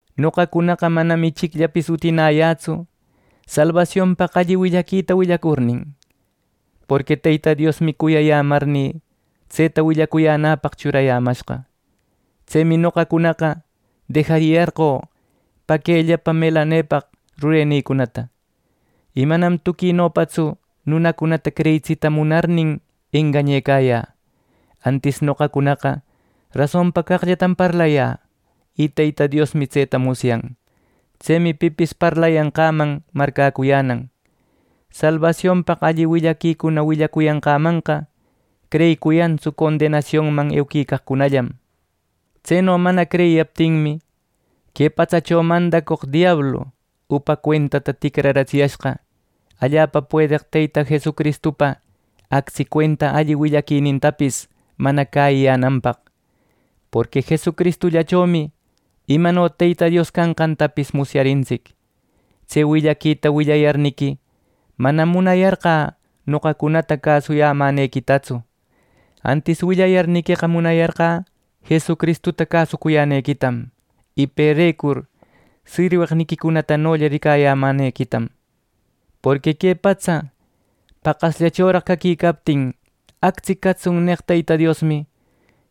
Noqacunaqa manam ichicllapis utinäyätsu salbasionpaq alli willaquita willacurnin, porqui Teyta Diosmi cuyayämarnï tseta willacuyänäpaq churayämashqa. Tsemi noqacunaqa dejariyarqö paquellapa melanepaq rurenïcunata. Y manam tuquinopatsu nunacunata creyitsita munarnin engañecayä. Antis noqacunaqa rasonpa caqllatam parlayä y Teyta Diosmi tseta musyan. Tsemi pipis parlayanqäman marcäcuyänan. Salbasionpaq alli willaquicuna willacuyanqämanqa creyicuyantsu condenasionman euquicaqcunallam. Tseno mana creyiyaptinmi, que patsacho mandacoq diablu upa cuentata ticraratsiyashqa allapa puedeq Teyta Jesucristupa actsi cuenta alli willaquinintapis mana cäyiyänanpaq. Porqui Jesucristullachomi imano Teyta Dios canqantapis musyarintsic. Tse willaquita willayarniqui, manam munayarqä noqacunata cäsuyämänequitatsu. Antis willayarniqueqa munayarqä Jesucristuta cäsucuyänequitam y perecur sirweqniquicunatanolla ricayämänequitam. Porqui que patsa paqasllachoraq caquicaptin “Actsi catsun” neq Teyta Diosmi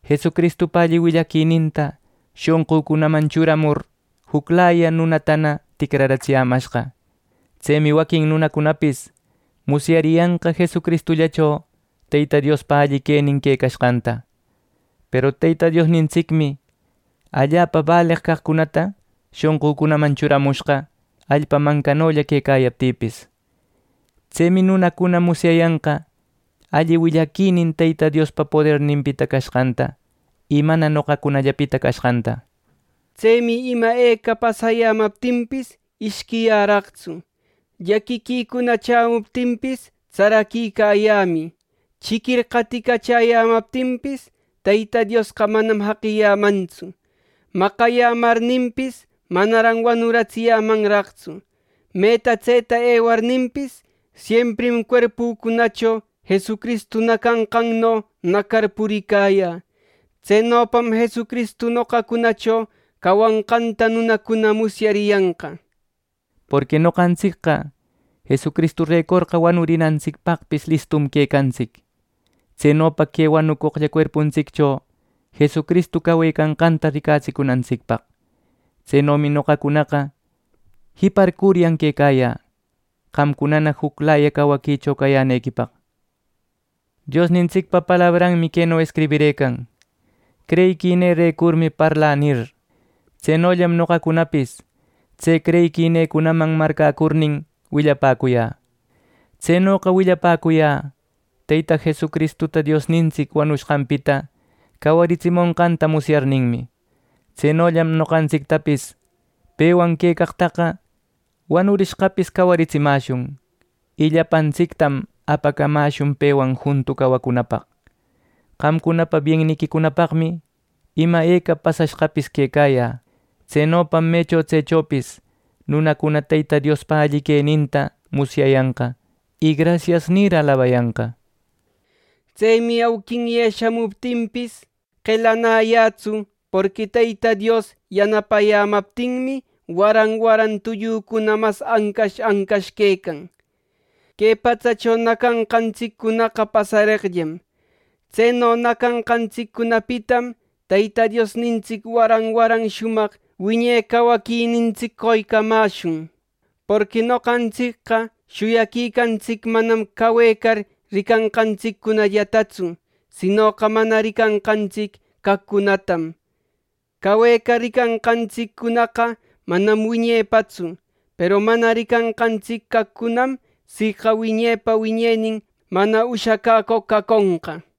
Jesucristupa alli willaquininta shonqücunaman churamur juclaya nunata ticraratsiyämashqa. Tsemi waquin nunacunapis musyariyanqa Jesucristullacho Teyta Diospa alli quenin quecashqanta. Peru Teyta Diosnintsicmi allapa baleq caqcunata shonqücunaman churamushqa, allpa mancanolla quecayaptïpis. Tsemi nunacuna musyayanqa alli willaquinin Teyta Diospa poderninpita cashqanta, y mana noqacunallapita cashqanta. Tsemi ima eca pasayämaptinpis ishquiyäraqtsu. Llaquiquicuna chämuptinpis tsaraquicayämï. Chiquir qaticachäyämaptinpis, Teyta Diosqa manam jaqiyämantsu. Maqayämarnïpis, manaran wanuratsiyämanraqtsu. Meta tseta ewarninpis, siemprim cuerpücunacho Jesucristu nacanqanno nacar puricayä. Tsenopam Jesucristu noqacunacho cawanqanta nunacuna musyariyanqa. Porqui noqantsicqa Jesucristurecorqa wanurinantsicpaqpis listum quecantsic. Tsenopa que wanucoqlla cuerpuntsiccho Jesucristu cawecanqanta ricatsicunantsicpaq. Tsenomi noqacunaqa jiparcuryan quecayä, qamcunana juclaya cawaquicho cayänequipaq. Diosnintsicpa palabranmi queno escribirëcan: “Creyiquinïrecurmi parlä” nir. Tsenollam noqacunapis tse creyiquinïcunaman marcäcurnin willapäcuyä. Tsenoqa willapäcuyä Teyta Jesucristuta Diosnintsic wanushqanpita cawaritsimonqanta musyarninmi. Tsenollam noqantsictapis pewan quecaqtaqa wanurishqapis cawaritsimäshun, y llapantsictam apacamäshun pewan juntu cawacunapaq. Qamcunapa bienniquicunapaqmi ima eca pasashqapis quecayä. Tsenopam mecho tsechopis nunacuna Teyta Diospa alli queninta musyayanqa, y “Grasias” nir, alabayanqa. Tsemi auquinye shamuptinpis, qelanäyätsu; porqui Teyta Dios yanapayämaptinmi waran waran tullücuna mas ancash ancash quecan. Que patsacho nacanqantsiccunaqa pasareqllam. Tseno nacanqantsiccunapitam Teyta Diosnintsic waran waran shumaq wiñe cawaquinintsic qoycamäshun. Porqui noqantsicqa shuyaquicantsic manam cawecar ricanqantsiccunallatatsu; sinoqa mana ricanqantsic caqcunatam. Cawecar ricanqantsic caqcunaqa manam wiñepaqtsu, peru mana ricanqantsic caqcunam siqa wiñepa wiñenin mana ushacäcoq caconqa.